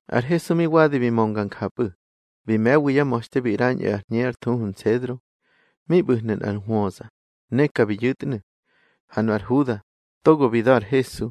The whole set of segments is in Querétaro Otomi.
Ar Hesu mi wadi bi mönga njapꞌu̱, bi me̱wi yá ma̱xte bi ꞌrañꞌu̱ ar hñe ár thuhu Nsedro. Mi ꞌbu̱hnu̱ nꞌar hwöza, ne ka bi yu̱tnu̱. Ha nu ar Huda, togo bi da̱ ar Hesu,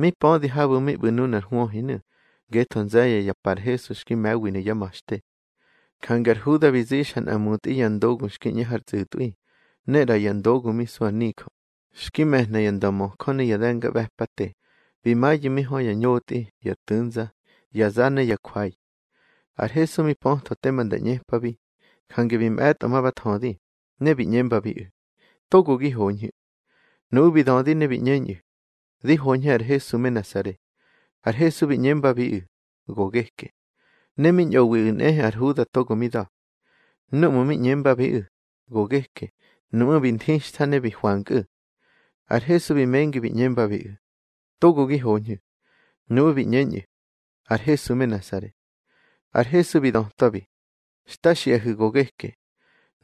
mi pödi habu̱ mi ꞌbu̱ nunar hwöhinu̱, ngetho nze̱ye̱ ya pa ar Hesu xki me̱winu̱ yá ma̱xte. Jange ar Huda bi zixa nꞌa mutꞌi ya ndogu xki ꞌñe har tsꞌu̱tꞌwi, ne ꞌra ya ndogu mi su ar nijö, xki me̱hna ya ndömöjö ne ya de̱ngaꞌbe̱pate, bi mayu̱ mi hö ya ñotꞌi, ya tu̱nza, ya za ne ya jwai. Ar Hesu mi pötho tema nda ꞌñepabi, jange bi mꞌe̱tꞌo ma ba thödi, ne bi ꞌñembabiꞌu̱: —Togo gi hoñhu̱. Nuꞌu̱ bi dödi ne bi ꞌñeñꞌu̱: —Di hoñhe ar Hesu me Nasare. Ar Hesu bi ꞌñembabiꞌu̱: —Go geke. Ne mi ñꞌowiꞌu̱ nꞌehe ar Huda togo mi da̱. Núꞌmu̱ mi ꞌñembabiꞌu̱: Go geke, nuꞌmú̱ bi nthixtha ne bi hwankꞌu̱. Ar Hesu bi mengi bi ꞌñembabiꞌu̱: —Togo gi hoñhu̱. Nuꞌu̱ bi ꞌñeñꞌu̱: —Ar Hesu me Nasare. Ar Hesu bi dötwabi: —Xta xiꞌahu̱, go geke.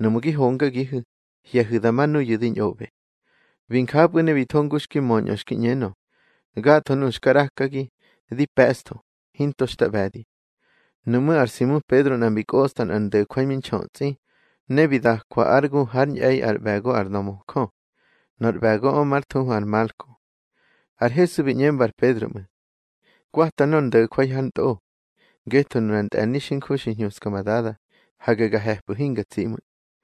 Nuꞌmu̱ gi hongagihu̱, hye̱hu̱ da ma nuyu̱ di ñꞌoꞌbe. Bi njapꞌu̱ ne bi tho ngu xki möñꞌö xki ꞌñenö: Gatho nuꞌu̱ xka ꞌrakagi, di pe̱ꞌstho, hinto xta ꞌbe̱di. Nuꞌmú̱ ar Simu Pedro nꞌa mbi kꞌosta nꞌar ndo̱jwai mi nxötsꞌi, ne bi dakwa ár gu hár ñꞌe̱i ár ꞌbe̱go ar ndömöjö. Nor ꞌbe̱goꞌö már thuhu ar Malko. Ar Hesu bi ꞌñemba ar Pedro ꞌmu̱: —Kwata nor ndo̱jwai hár ntꞌo. Ngetho nunar ntꞌe̱ni xinju xi hñuska ma Dada, hage ga he̱pꞌu̱ hinga tsi ꞌmu̱.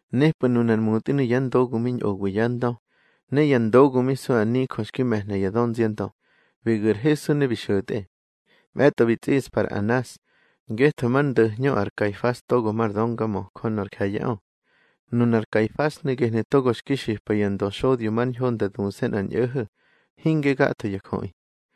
Nepꞌu̱ nunar mutꞌinu̱ ya ndogu mi ñꞌowi yá ndö, ne ya ndogu mi su ar nijö xki me̱hna ya dönziandö, bi gu̱ ar Hesu ne bi xo̱tꞌe. Mꞌe̱tꞌo bi tsꞌiꞌspa ar Anas, ngetho már ndo̱hñö ar Kaifas togo mar döngamöjö nor je̱ye̱ꞌö. Nunar Kaifasnu̱ gehnu̱ togo xki xipa ya ndöxodyo mar ñho nda duse̱ nꞌar ñꞌo̱ho̱, hinge gatho ya jöꞌi.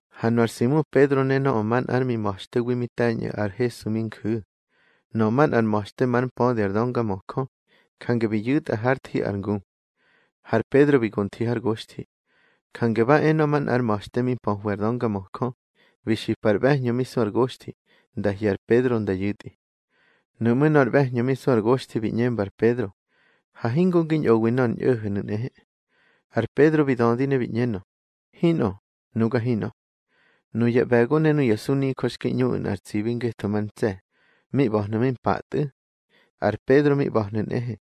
Ha nu ar Simu Pedro ne nöꞌö manꞌa ár mima̱xtewi mi te̱ñꞌu̱ ar Hesu mi nju̱. Nöꞌö manꞌar ma̱xte már mpödi ar döngamöjö, jange bi yu̱tꞌa hár thi ar ngu. Har Pedro xki go nthi har goxthi. Jange ba e nöꞌö manꞌar ma̱xte mi mpöhwi ar döngamöjö, bi xipa ar ꞌbe̱hñö mi su ar goxthi, nda hye̱ ar Pedro nda yu̱tꞌi. Nuꞌmú̱ nor ꞌbe̱hñö mi su ar goxthi bi ꞌñemba ar Pedro: —Ha hingo ngi ñꞌowi nor ñꞌo̱ho̱nu̱ nꞌehe. Ar Pedro bi dödi ne bi ꞌñenö: —Hinꞌö, nuga hinꞌö. Nuya ꞌbe̱go ne nuya sunijö xki ꞌñuꞌu̱ nꞌar tsibi ngetho mar ntse̱, mi ꞌba̱hnu̱ mi mpatꞌu̱. Ar Pedro mi ꞌba̱hnu̱ nꞌehe.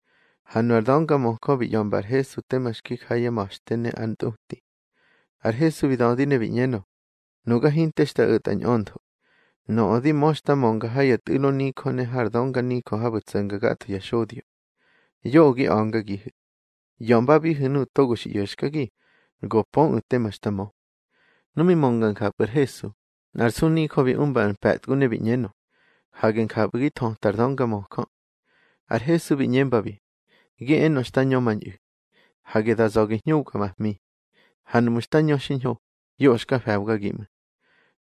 Ha nu ar döngamöjö bi ꞌya̱mba ar Hesu tema xki ja yá ma̱xte ne ár ntꞌuti. Ar Hesu bi dödi ne bi ꞌñenö: —Nuga hinte xta o̱tka ñꞌöntho. Nöꞌö di mö xta mönga ha ya tꞌu̱lo nijö ne har dönganijö habu̱ tso̱nga gatho ya xodyo. Yoꞌö gi a̱ngagihu̱. ꞌYa̱mbabihu̱ nuꞌu̱ togo xi ꞌyo̱xkagi, go pöꞌu̱ tema xta mö. Nu mi mönga njapꞌu̱ ar Hesu, nꞌar sunijö bi umba nꞌar mpe̱tgu ne bi ꞌñenö: —Hage njapꞌu̱ gi thöta ar döngamöjö. Ar Hesu bi ꞌñembabi: —Gi enö xta ñömañꞌu̱. Hage da za̱ gi hñubga ma hmi. Ha nuꞌmu̱ xta ñö xiñho, yoꞌö xka fe̱bgagi ꞌmu̱.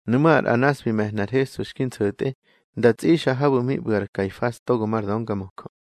Nuꞌmú̱ ar Anas bi me̱hna ar Hesu xki nso̱tꞌe, nda tsꞌixa habu̱ mi ꞌbu̱ ar Kaifas togo mar döngamöjö.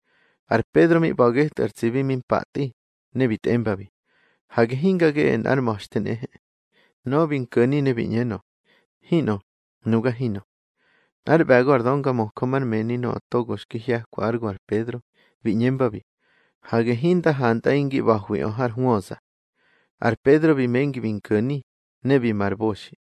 Ar Pedro mi ꞌba̱ getꞌu̱ ar tsibi mi mpatꞌi, ne bi tꞌembabi: —Hage hinga geꞌe nꞌár ma̱xte nꞌehe. Nöꞌö bi nko̱ni ne bi ꞌñenö: —Hinꞌö, nuga hinꞌö. Nꞌár ꞌbe̱go ar döngamöjö már mëni nöꞌö togo bi hye̱kwa ár gu ar Pedro, bi ꞌñembabi: —Hage hinda hantꞌaꞌi ngi ꞌba̱hwiꞌö har hwöza. Ar Pedro bi mengi bi nko̱ni, ne bi ma ar boxi.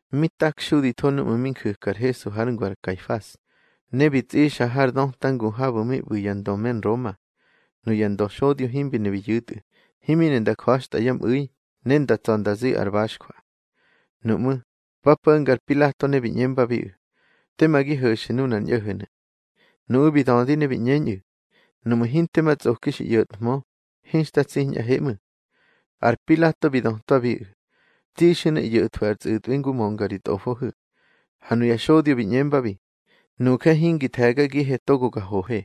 Mi takxuditho núꞌmu̱ mi nju̱ka ar Hesu hár ngu ar Kaifas, ne bi tsꞌixa har döta ngu habu̱ mi ꞌbu̱ ya ndö me Nroma. Nuya ndöxodyo himbi ne bi yu̱tꞌu̱, himi ne nda ja̱xtꞌa yá mꞌu̱i, ne nda tsa̱ nda zi ar baxjwa. Nuꞌmú̱, ba po̱nga ar Pilato ne bi ꞌñembabiꞌu̱: —Tema gi ho̱xu̱ nunar ñꞌo̱ho̱nu̱. Nuꞌu̱ bi dödi ne bi ꞌñeñꞌu̱: —Nuꞌmu̱ hinte ma tsꞌoki xi ꞌyo̱thmö, hinxta tsiñꞌahe ꞌmu̱. Ar Pilato bi dötwabiꞌu̱: —Tsixu̱ ne ꞌyo̱thwu̱ ar tsꞌu̱tꞌwi ngu mönga ri tꞌofohu̱. Ha nuya xodyo bi ꞌñembabi: —Nuje hingi the̱gagihe togo ga hohe.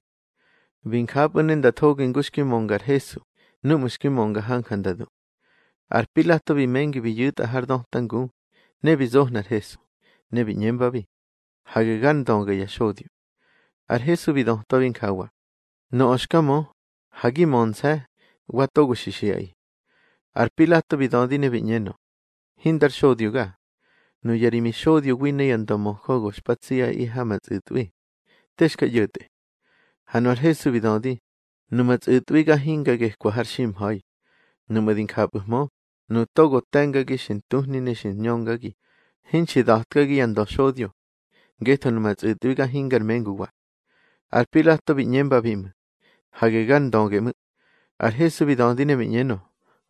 Bi njapꞌu̱ ne nda thogi ngu xki mönga ar Hesu, núꞌmu̱ xki mönga hanja nda du. Ar Pilato bi mengi bi yu̱tꞌa har döta ngu, ne bi zohna ar Hesu, ne bi ꞌñembabi: —Hage gár ndöge ya xodyo. Ar Hesu bi dötwabi njawa: —Nöꞌö xka mö, ha gi mönse̱, wa togo xi xiꞌaꞌi. Ar Pilato bi dödi ne bi ꞌñenö: —Hindar xodyoga. Nuya ri mixodyowi ne ya ndömöjö go xpa tsiꞌaꞌi ha ma tsꞌu̱tꞌwi. Te xka ꞌyo̱tꞌe. Ha nu ar Hesu bi dödi: —Numa tsꞌu̱tꞌwiga hinga gekwa har ximha̱i. Nuꞌmu̱ di njapꞌu̱hmö, nuꞌu̱ togo te̱ngagi xi ntuhni ne xi ñöngagi, hinxi nda̱tkagi ya ndöxodyo. Ngetho numa tsꞌu̱tꞌwiga hingar menguwa. Ar Pilato bi ꞌñembabi ꞌmu̱: —Hage gar ndöge ꞌmu̱. Ar Hesu bi dödi ne bi ꞌñenö: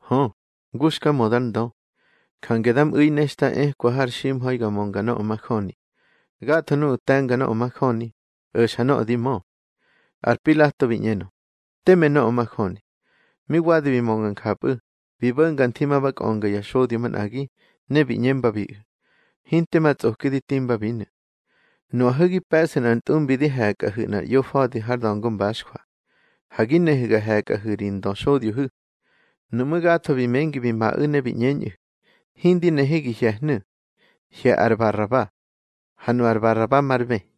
—Hö, ngu xka mö dar ndö. Jange da mꞌu̱i ne xta ekwa har ximha̱i ga mönga nöꞌö majöni. Gatho nuꞌu̱ te̱nga nöꞌö majöni, o̱xa nöꞌö di mö. Ar Pilato bi ꞌñenö: —Teme nöꞌö majöni. Mi wadi bi mönga njapꞌu̱, bi bo̱nga nthi ma ba kꞌönga ya xodyo manꞌagi, ne bi ꞌñembabiꞌu̱: —Hinte ma tsꞌoki di timbabinu̱. Nuꞌahu̱ gi pe̱ꞌsu̱ nꞌar ntꞌumbi di he̱kꞌahu̱ nꞌar ꞌyofa̱di har da̱ngo mbaxjwa. Ha gi nehu̱ ga he̱kꞌahu̱ ri Ndöxodyohu̱. Nuꞌmú̱ gatho bi mengi bi maꞌu̱ ne bi ꞌñeñꞌu̱: —Hindi nehe gi hye̱hnu̱. Hye̱ ar Baraba. Ha nu ar Baraba mar bë.